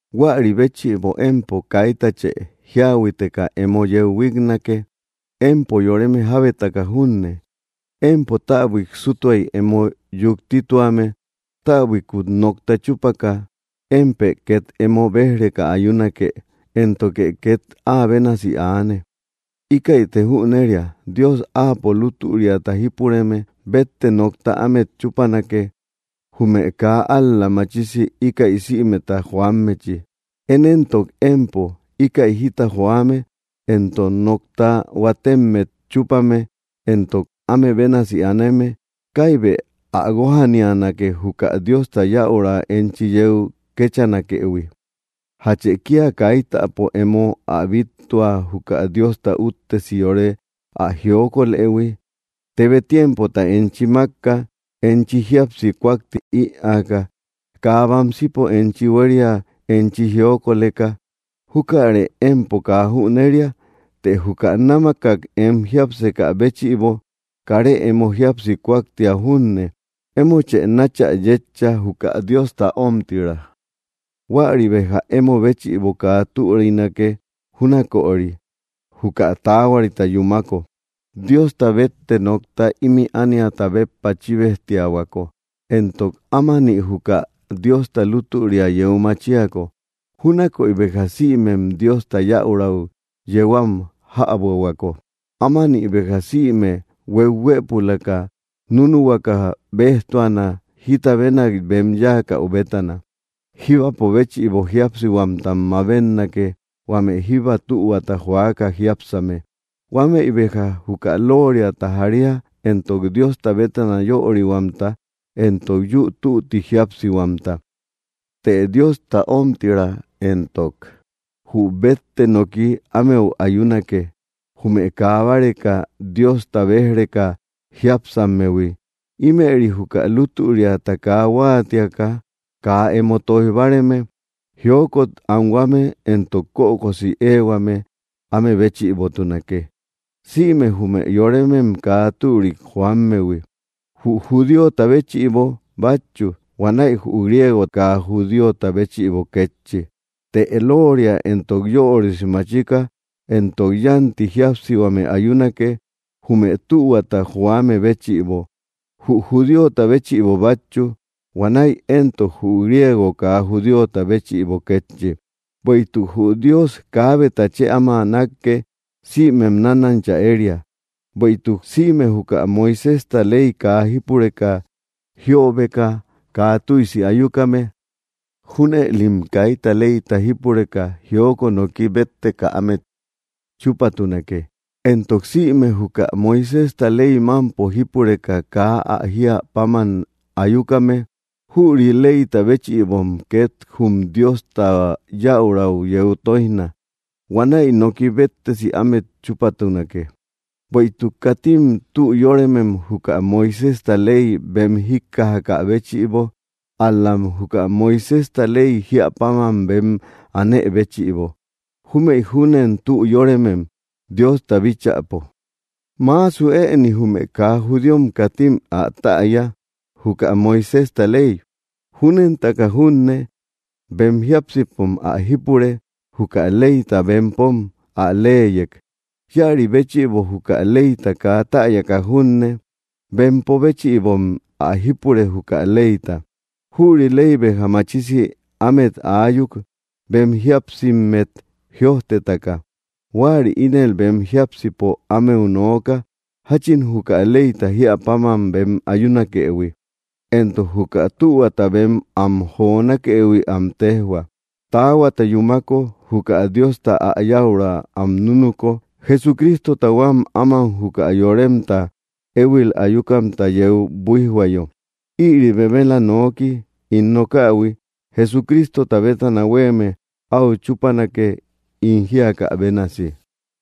Huäri béchïbo empo kaitachë jíahuiteka emo yeu huíknake, empo yoreme jábetaka junne. Empo täbuik sútuay emo yuktituame, täbuikut nokta chúpaka, émpë két emo béj‑reka ayunake; éntoke két áa bénasi aane. Íkäite jüneria: Dios áapo lútüriata jípureme bétte nokta ámet chúpanake, jume kaa ál‑la machisi íkäi sïmeta joammechi. Én éntok empo, íkäi jita joame entok nokta huatemmet chúpame entok áme bénasi aneme, ¡kaibë ä guójanianake, juka Diosta yäurau enchi yeu kéchanakëhui! ¿Jachë kia kaitapo emo ä bittua juka Diosta úttesi yore ä jiokolëhui? Tebe tiempota enchi mákka, enchi jíapsi kuakti ïaaka, kaa bamsipo enchi huéria enchi jiokoleka. ¿Jukarë empo kaa jüneria? Të juka námakak em jiápsekä béchïbo, karë emo jíapsi kuaktia junne; emochë náchä yétcha, juka Diosta ómtira; huäri béja emo béchïbo kaa türinake júnaköri, juka taahuarita yúmako, Diosta bétte nokta ímï ániata béppa chíbejtiahuako, entok ámani juka Diosta lutüria yeu machiako, júnakoy béja sïmem Diosta yäurau yeu am jäbuahuako. Ámani béja sïme hueuhuëpulaka núnuhuakä béjtuana, jita bénak bem yáakäu bétana. Jíbapo béchïbo jíapsihuamtam mabetnake, huame jíba tühuata joaka jiápsakame. Huamëi béja juka lóoriata jaria, entok Diosta bétana yörihuamta entok yü tütti jíapsihuamta. Të Diosta ómtira entok jü bétte noki ámeu ayunake, jume kaa báreka Diosta béj‑reka jiápsammehui. Ímëri juka lútüriata kaa huáatiaka, kaa emo tóij báareme. Jiokot anhuame entok kökosi éehuame áme béchïbotunake, sïme jume yoremem kaa türik joammehui, jü judíota béchïbo bátchu, huanäi jü griego kaa judíota béchïbo kétchi. Të lóoria entok yörisi machika entok yánti jíapsihuame ayunake, jume tühuata joame béchïbo, jü judíota béchïbo bátchu, huanäi entok jü griego kaa judíota béchïbo kétchi. Bueïtuk jü Dios kaabeta chë áma nákke; sïmem nánancha éria. Bueïtuk sïme juka Moiséjta ley kaa jípureka jiöbeka kaa tüisi ayukame, junëlim kaita leyta jípureka jiokot noki bétteka ámet chúpatunake; entok sïme juka Moiséjta ley mámpo jípureka kaa ä jíä páman ayukame, jüri leyta béchïbom két jum Diosta yäurau yeu tóijna. Huanäi noki béttesi ámet chúpatunake. Bueïtuk katim tü yóremem juka Moiséjta ley bem jíkkajakä béchïbo, ál‑lam juka Moiséjta ley jíä páman bem anë béchïbo; júmëï júnen tü yóremem, Diosta bíchäpo. Maasu ëni jume kaa judíom, katim ä täya, juka Moiséjta ley. Júnentaka junne, bem jiápsipom ä jípure, juka leyta bempom ä leyek. Íäri béchïbo, juka leyta kaa täyaka junne, bempo béchïbom ä jípure, juka leyta. Jüri ley béja machisi ámet aayuk, bem jíapsimmet jïojtetaka. Huäri ínel bem jiápsipo ámeu nooka, jáchin juka leyta jíä páman bem ayunakëhui; entok juka tühuata bem am jonakëhui am téjhua, taahuata yúmako, juka Diosta ä yäurau am núnuko, Jesucristota huám áman juka yoremtat éhuil ayukamta yeu buíjhuayo. Ïri bemela noki ín nokähui, Jesucristota bétana huéeme, áu chúpanake ín jíakä bénasi.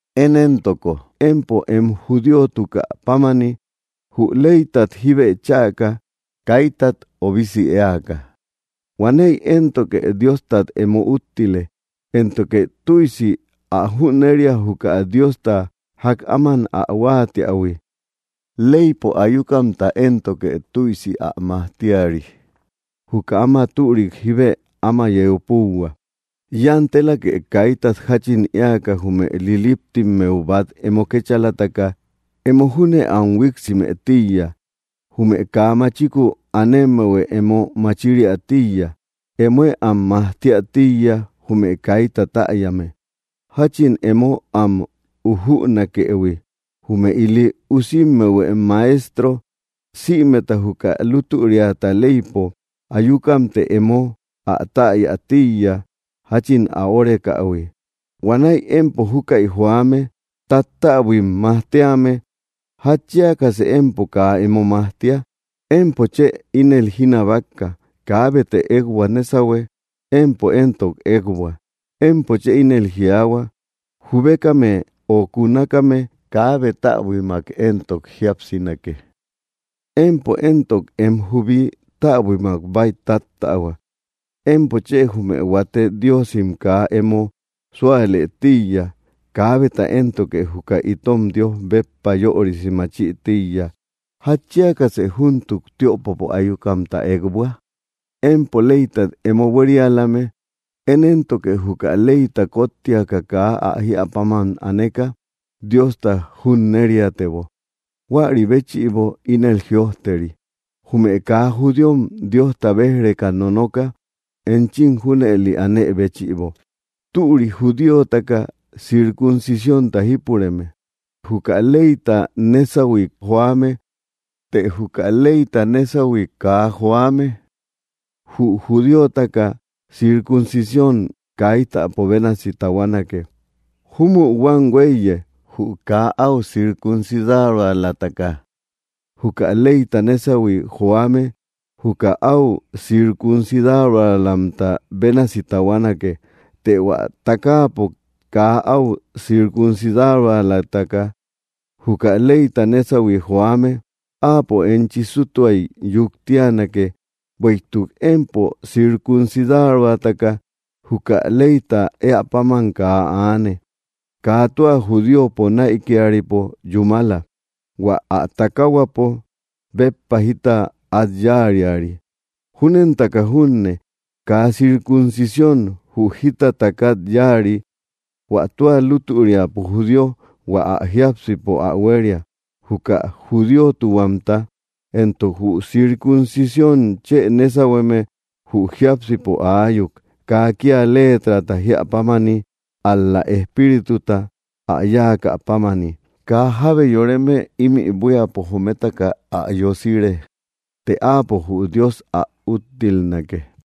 Én éntoko empo em judíotukä pámani, jü leytat jibë chäka, kaitat obisi éaka, huanäi éntoke Diostat emo úttile. Éntoke tüisi ä jüneria, juka Diosta jak áman ä huáatiähui; leypo ayukamta éntoke tüisi ä majtiari; juka áma türik jíbe áma yeu púuhua. Yantelake kaitat jáchin éaka jume liliptimmeu bát emo kécháalataka emo júne am huiksimë tíiya; jume kaa machiku anemehuë emo machiriä tíiya; emoë am majtiä tíiya, jume kaita täyame, jáchin emo am ujünakëhui, jume ili usimmehuë maejtro; sïmeta juka lútüriata leypo ayukamtë emo ä täya tíiya, jáchin ä órekähui. Huanäi empo júkäi joame, tattäbuim majtíame, ¿jatchiakasë empo kaa emo majtia? Empo chë ínel jinabakka: kaabetë ékbua nésahue; ¡empo éntok ékbua! Empo chë ínel jiaahua: jubekame ö kunakame kaabe täbuimak entok jíapsinake. ¡Empo éntok em jubi täbuimak bäitattähua! Empo chë jume huate Diosim kaa emo súalë tíiya, kaabeta éntoke juka itom Dios béppa yörisi machï tíiya; ¿jatchiakasë júntuk tiöpopo ayukamta ékbua? Empo leytat emo buérialame; ¡én éntoke juka leyta kóttiaka kaa ä jíä páman aneka, Diosta junneriatebo! Huäri béchïbo ínel jïojteri: “Jume kaa judíom Diosta béj‑reka nonoka, enchim junëli anë béchïbo.” Türi judíotaka circuncisiónta jípureme, juka leyta nesahui joame; të juka leyta nesahui kaa joame; jü judíotaka circuncisión kaitapo bénasi tahuanake. Júmü huám huéiye, jü kaa áu circuncidaroalataka juka leyta nesahui joame, juka áu circuncidaroalamta bénasi tahuanake. Të hua takaapo kaa áu circuncidaroalataka juka leyta nesahui joame, áapo enchi sútuay yuktianake, bueïtuk empo circuncidaroataka juka leyta éä páman kaa aane. Kaa tua judíopo näikiaripo yúmala, hua ä takaahuapo béppa jita át yáariari; júnentaka junne, kaa circuncisión jü jita takat yáari. Huä tua lútüriapo judío hua ä jiápsipo ä huéria, juka judíotuhuamta; entok jü circuncisión chë nésahueme jü jiápsipo aayuk, kaa kía leetrata jíä pámani, ál‑la Espírituta ä yáakä pámani. Kaa jábe yoreme ímï buíapo jometaka ä yosire, të áapo jü Dios ä úttilnake.